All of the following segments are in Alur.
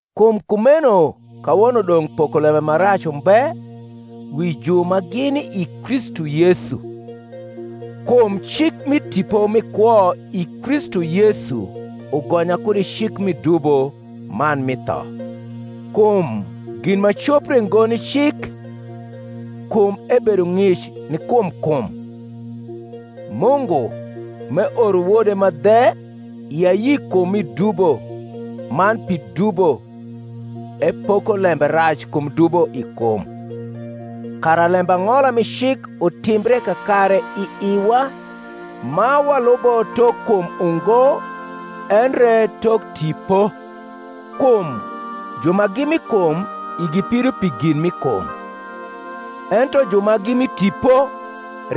Kum kumeno kawono dong’ pokolembe ma rac umbe wi ju ma gini i Kristu Yesu. Kum cik mi Tipo mi kwo i Kristu Yesu ugonya kud i cik mi dubo man mi tho. Kum gin ma copre ngo ni cik, kum ebedo ng’ic ni kum kum, Mungu, m’eoro Wode ma dhe i ayi kum mi dubo man pi dubo, epoko lembe rac kum dubo i kum: kara lembang’ola mi cik utimbre kakare i iwa, ma walubo tok kum ungo, endre tok Tipo. Kum ju ma gi mi kum igi pido pi gin mi kum; ento ju ma gi mi Tipo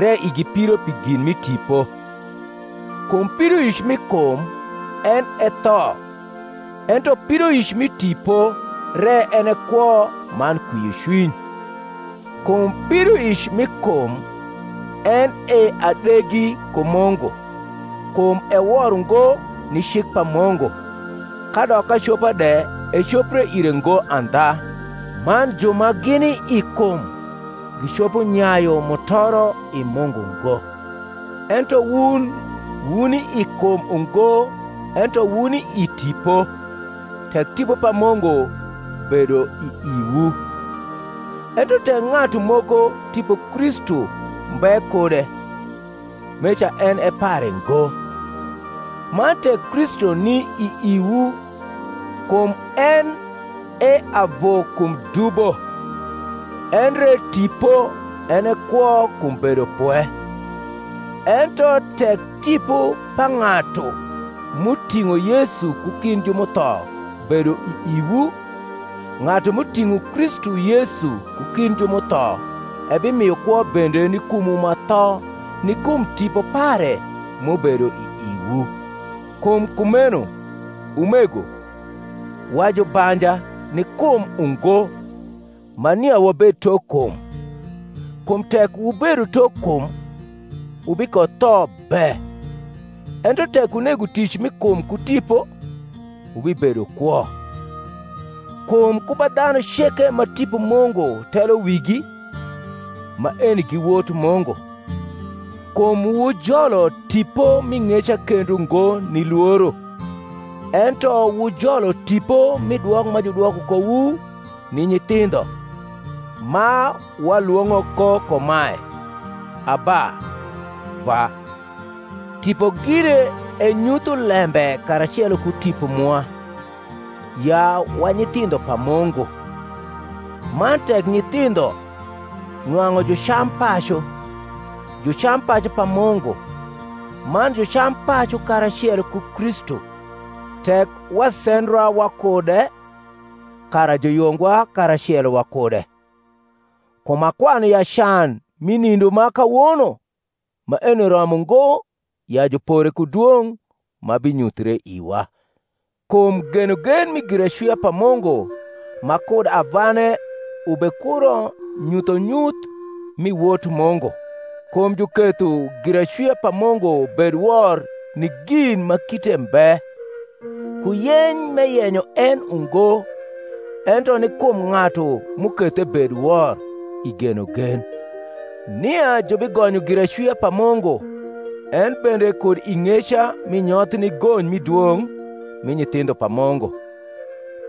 re igi pido pi gin mi Tipo. Kum pidoic mi kum en e tho; ento pidoic mi Tipo re en e kwo man kwiocwiny: kum pidoic mi kum en e adegi ku Mungu; kum e wor ungo ni cik pa Mungu, kadok acopa de ecopre ire ngo andha; man ju ma gini i kum gicopo nyayu mutoro i Mungu ngo. Ento wun wuni i kum ungo ento wuni i Tipo, tek Tipo pa Mungu bedo i iwu. Ento tek ng’atu moko Tipo Kristu mbe kude, meca en e pare ngo. Man tek Kristu ni i iwu, kum en e avu kum dubo; endre tipo en e kwo kum bedopwe. Ento tek Tipo pa ng’atu m’uting’o Yesu ku kind ju m’utho bedo i iwu, ng’atu m’uting’o Kristu Yesu ku kind ju m’utho ebimio kwo bende ni kumwu ma tho ni kum Tipo pare m’ubedo i iwu. Kum kumeno, umego, wa jubanja, ni kum ungo, ma nia wabed tok kum: kum tek wubedo tok kum, wubikotho be; ento tek wunego tic mi kum ku Tipo, wubibedo kwo. Kum ku ba dhanu ceke ma Tipo Mungu telo wigi, maeni gi wot Mungu. Kum wujolo tipo mi ng’eca kendo ngo ni lworo, ento wujolo tipo mi dwok ma judwoko kowu ni nyithindho, ma walwong’o ko kumae, Abba, Vwa. Tipo gire enyutho lembe karacelo ku tipo mwa, ya wa nyithindho pa Mungu: man tek nyithindho, nwang’u jucampacu; jucampacu pa Mungu, man jucampacu karacelo ku Kristu; tek wasendra wakude, kara juyungwa karacelo wakude. Kum akwanu ya can mi nindoma kawono maeni romo ngo ya jupore ku dwong’ ma binyuthre iwa. Kum genogen mi giracwia pa Mungu ma kud avane ubekuro nyuthonyuth mi wot Mungu. Kum juketho giracwia pa Mungu bed wor ni gin ma kite mbe, ku yeny m’eyenyo en ungo, ento ni kum ng’atu m’uketho ebed wor, i genogen, nia jubigonyo giracwia pa Mungu en bende kud i ng’eca mi nyoth ni gony mi dwong’ mi nyithindho pa Mungu.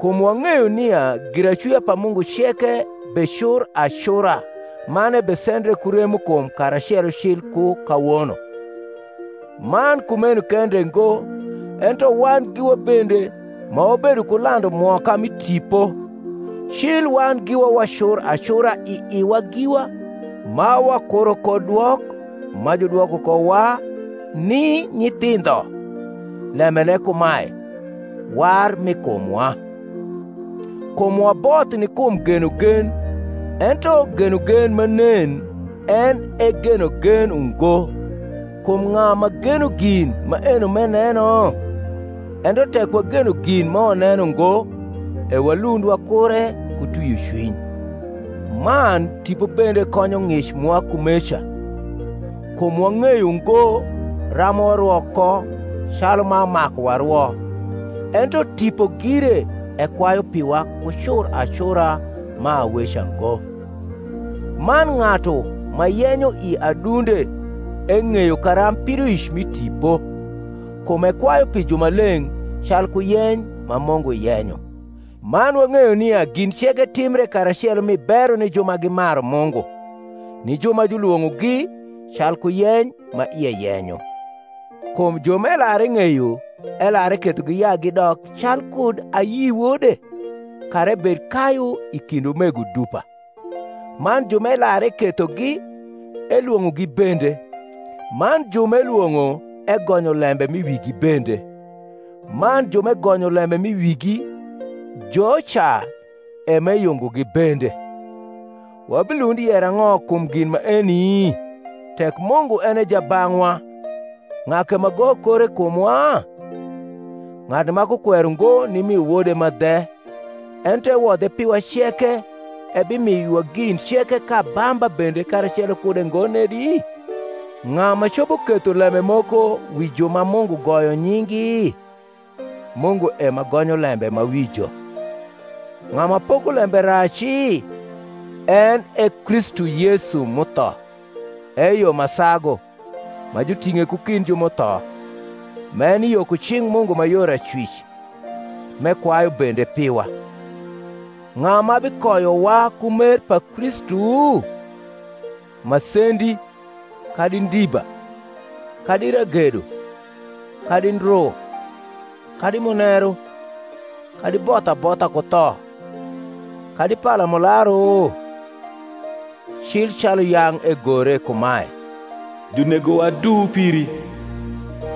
Kum wang’eyo nia giracwia pa Mungu ceke becur acura man ebesendre ku remokum karacelo cil ku kawono. Man kumeno kende ngo, ento wan giwa bende, ma wabedo ku landu mwoka mi Tipo, cil wan giwa wacur acura i iwa giwa, ma wakuro ko dwok ma judwoko kowa ni nyithindho, lembene kumae, war mi kumwa. Kum waboth ni kum genogen: ento genogen ma nen en e genogen ungo: kum ng’a ma geno gin maeno m’eneno? Ento tek wageno gin ma waneno ngo, e walund wakure ku twiocwiny. Man Tipo bende konyo ng’ic mwa kumeca: kum wang’eyo ngo ram warwo ko calu ma maku warwo: ento Tipo gire ekwayu piwa ku cur acura ma aweca ngo; man ng’atu ma yenyo i adunde eng’eyo karamb pidoic mi Tipo, kum ekwayu pi jumaleng’ calku yeny ma Mungu yenyo. Man wang’eyo nia gin ceke timbre karacelo mi bero ni ju ma gimaru Mungu, ni ju ma julwong’ogi calku yeny ma ie yenyo Kum ju m’elar eng’eyo, elar ekethogi ya gidok calkud ayi Wode, kara ebed kayu i kind umego dupa: man ju m’elar ekethogi, elwong’ogi bende: man ju m’elwong’o egonyo lembe m’i wigi bende: man ju m’egonyo lembe m’i wigi, joca e m’eyungogi bende. Wabilund yero ang’o kum gin maeni? Tek Mungu en e jabang’wa, ng’a ke ma goyo kore i kumwa? Ng’atu ma kukwero ngo nimio Wode ma dhe, ento ewodhe piwa ceke, ebimio iwa gin ceke k’abamba bende karacelo kude ngo nedi? Ng’a ma copo ketho lembe moko wi ju ma Mungu goyo nying’gi? Mungu e ma gonyo lembe ma wi jo; ng’a ma poko lembe raci? en e Kristu Yesu m’utho, eyo ma sagu, ma juting’e ku kind ju m’utho, m’eni yo ku cing’ Mungu ma yor acwic, m’ekwayu bende piwa. Ng’a ma bikoyowa ku mer pa Kristu? masendi, kadi ndiba, kadi ragedo, kadi ndru, kadi muneru, kadi both abotha ku tho, kadi palamularu? Cil calu yang’ egore kumae, Junegowa duu piri;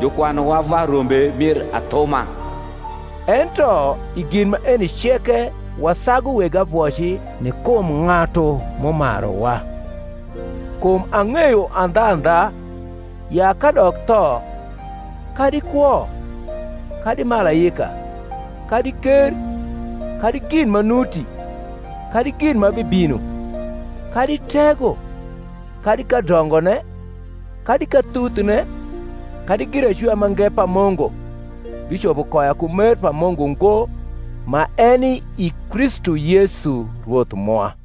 Jukwanuwa va rombe mir athuma. Ento, i gin maeni ceke wasagu weg avoci ni kum ng’atu m’umaruwa. Kum ang’eyo andhandha, ya kadok tho, kadi kwo, kadi malaika, kadi ker, kadi gin ma nuti, kadi gin ma bibino, kadi tego, kadi kadongone, kadi kathuthne, kadi giracwia mange pa Mungu, bicopo koya ku mer pa Mungu ngo, ma eni i Kristu Yesu Rwoth mwa.